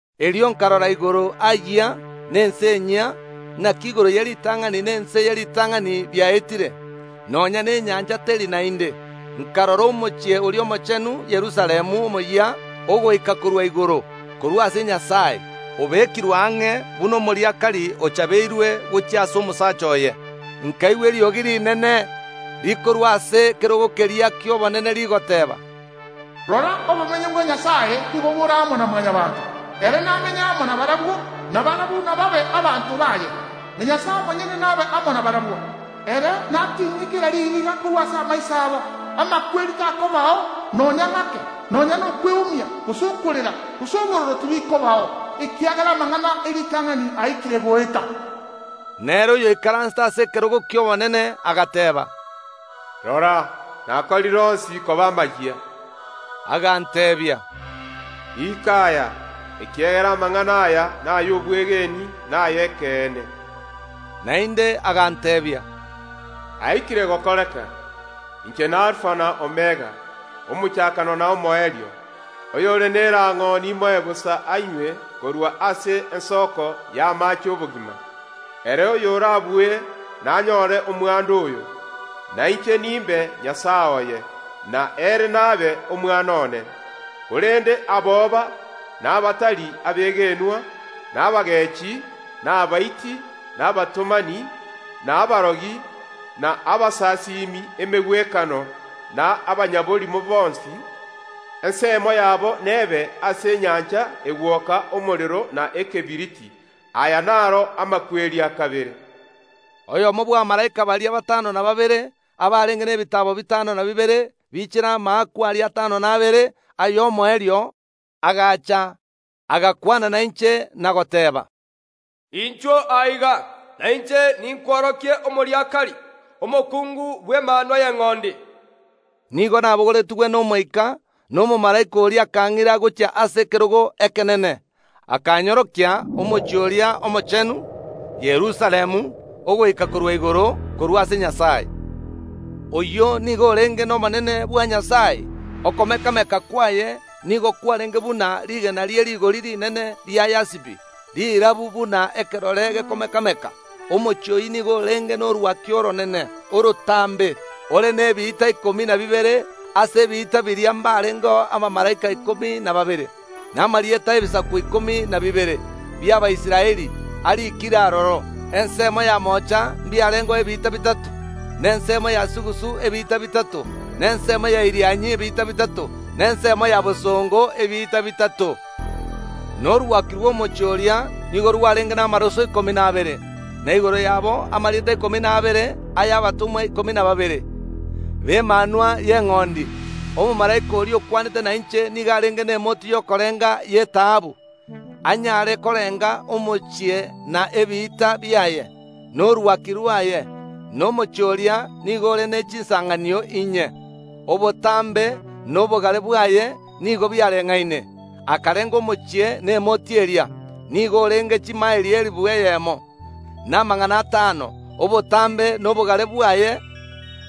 Erio nkarora igoro aayia na ense enyia, naki igoro ye ritang’ani na ense ye ritang’ani biaetire, nonya nenyancha teri naende. Nkarora omochie oria omochenu, Yerusalemu omoyia, ogoika korwa igoro korwa ase Nyasae, obekirwe ang’e buna omoriakari ochabeirwe gochia ase omosacha oye. Nkaigwa eriogi rinene rikorwa ase ekerogo keria ki’obonene rigoteeba, “Rora obomenyo bwa Nyasae nigo bore amo na Mwanyabaanto. Ere namenye amo nabarabwo, na barabwo nababe abanto baye, na Nyasae omonyene nabe amo nabarabwo. Ere natinyie kera ririga korwa ase amaiso abo; amakweri takobao nonya ng’ake, nonya nokweumia, gose okorera, gose obororo tibikobao, ekiagera amang’ana e ritang’ani aikire goeta.” Na ere oyoikaransete ase ekerogo ki’obonene agateeba, “Rora, nakorire onsi koba amayia.” Aganteebia, “Riika aya, ekiagera amang’ana aya nay’obwegeni na ay’ekeene.” Naende aganteebia, “Aikire gokoreka. Inche n’Alifa na Omega, Omochakano na Omoerio. Oyore nerang’o nimoe bosa anywe korwa ase ensoko y’amaache ’obogima. Ere oyorabue nanyoore omwando oyo, na inche nimbe Nyasae oye, na ere nabe omwana one. Korende aboba, na abatari abegenwa, na abagechi, na abaiti, na abatomani, na abarogi, na abasasimi emegwekano na abanyaborimo bonsi; ensemo yabo nebe ase enyancha egwoka omorero na ekebiriti. Aya naro amakweri a kabere.” Oyomo bw’abamalaika baria batano na babere, abarenge nebitaabo bitano na bibere biichire amaakwa aria atano na abere ay’omoerio, agacha, agakwana nainche na goteeba, “Inchuo aiga, na inche ninkworokie omoriakari, omokungu bw’Emanwa y’Eng’ondi.” Nigo nabogoretigwe n’Omoika, na omomalaika oria akang’ira gochia ase ekerogo ekenene, akanyorokia omochie oria omochenu, Yerusalemu, ogoika korwa igoro korwa ase Nyasae. Oyio nigo orenge nobonene bwa Nyasae; okomekameka kwaye nigo kwarenge buna rigena rie rigori rinene ria yasipi, rirabu buna ekerore gekomeka‐meka. Omochie oyio nigo orenge norwaki oronene, orotambe, ore nebiita ikomi na bibere. Ase ebiita biria mbarengeo abamalaika ikomi na babere, na amarieta ’ebisaku ikomi na bibere bi’Abaisraeli ariikire aroro. Ensemo ya moocha mbiarengeo ebiita bitato, na ensemo ya sugusu ebiita bitato, na ensemo ya Irianyi ebiita bitato, na ensemo ya bosongo ebiita bitato. Na orwaki rw’omochie oria nigo rwarenge namaroso ikomi na abere, na igoro yabo amarieta ikomi na abere ay’abatomwa ikomi na babere b’Emanwa y’Eng’ondi. Omomalaika oria okwanete nainche nigo arenge nemoti y’okorenga y’etaabu, anyare korenga omochie na ebiita biaye, na orwaki rwaye. Na omochie oria nigo ore ne chinsanganio inye, obotambe na obogare bwaye nigo biareng’aine. Akarenga omochie nemoti eria. Nigo orenge chimaeli elifu eyemo, na amagana atano; obotambe na obogare bwaye,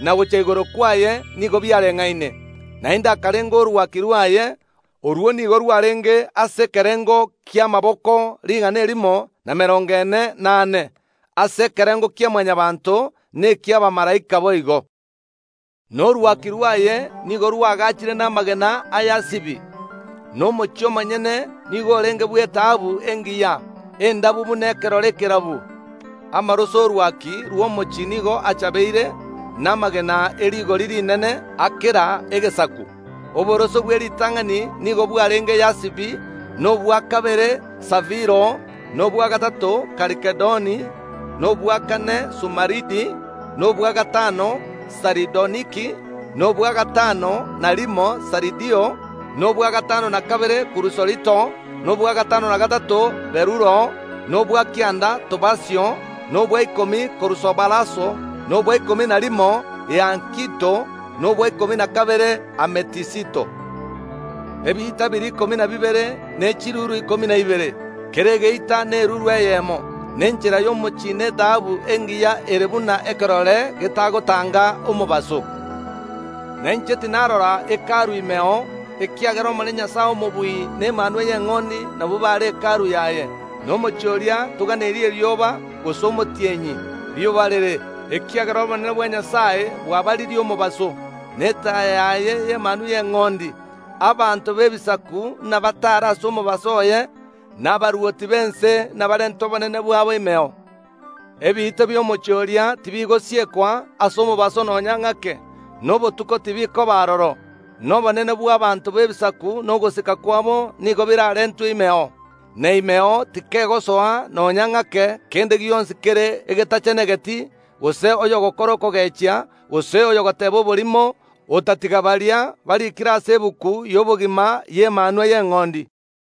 na gochia igoro kwaye nigo biareng’aine. Naende akarenga orwaki rwaye. Orwo nigo rwarenge ase ekerengo ki’amaboko rigana erimo na emerongo ene, na ane, ase ekerengo kia Mwanyabaanto, na eki’abamalaika boigo. Na orwaki rwaye nigo rwaagachire namagena a yasipi, na omochie omonyene nigo orenge bw’etaabu engiya, endabu buna ekerore ekerabu. Amaroso ’orwaki rw’omochie nigo achabeire namagena e rigori rinene a kera egesaku. Oboroso bw’eritang’ani nigo bwarenge yasipi, na obwa kabere safiro, na obwa gatato kalkedoni, na obwa kane sumaridi, na obwa gatano saridoniki, na obwa gatano na rimo sardio, na obwa gatano na kabere kurusolito, na obwa gatano na gatato berulo, na obwa kianda topasio, na obwa ikomi kurusoparaso, na obwa ikomi na rimo hiakinto, na obwa ikomi na kabere ametisito. Ebiita biria ikomi na bibere nechiruru ikomi na ibere, kera egeita neruru eyemo. Na enchera y’omochie netaabu engiya ere buna ekerore getagotanga omobaso. Na inche tinarora Hekalu imeo, ekiagera Omonene Nyasae Omobui na Emanwa y’Eng’ondi nabwo bare Hekalu yaye. Na omochie oria toganeiri erioba gose omotienyi biyobarere, ekiagera obonene bwa Nyasae bwabaririe omobaso, na etaya yaye n’Emanwa y’Eng’ondi. Abanto b’ebisaku nabataare ase omobaso oye, na abarwoti b’ense nabarente obonene bwabo imeo. Ebiita bi’omochie oria tibigosiekwa ase omobaso nonya ng’ake, na obotuko tibokoba aroro. Na obonene bw’abaanto b’ebisaku na ogosika kwabo nigo biraarentwe imeo. Na imeo tikegosoa nonya ng’ake kende gionsi kere egetachenegeti, gose oyogokora okogechia, gose oyogoteeba oborimo, otatiga baria barikire ase egetabu y’obogima y’Emanwa y’Eng’ondi.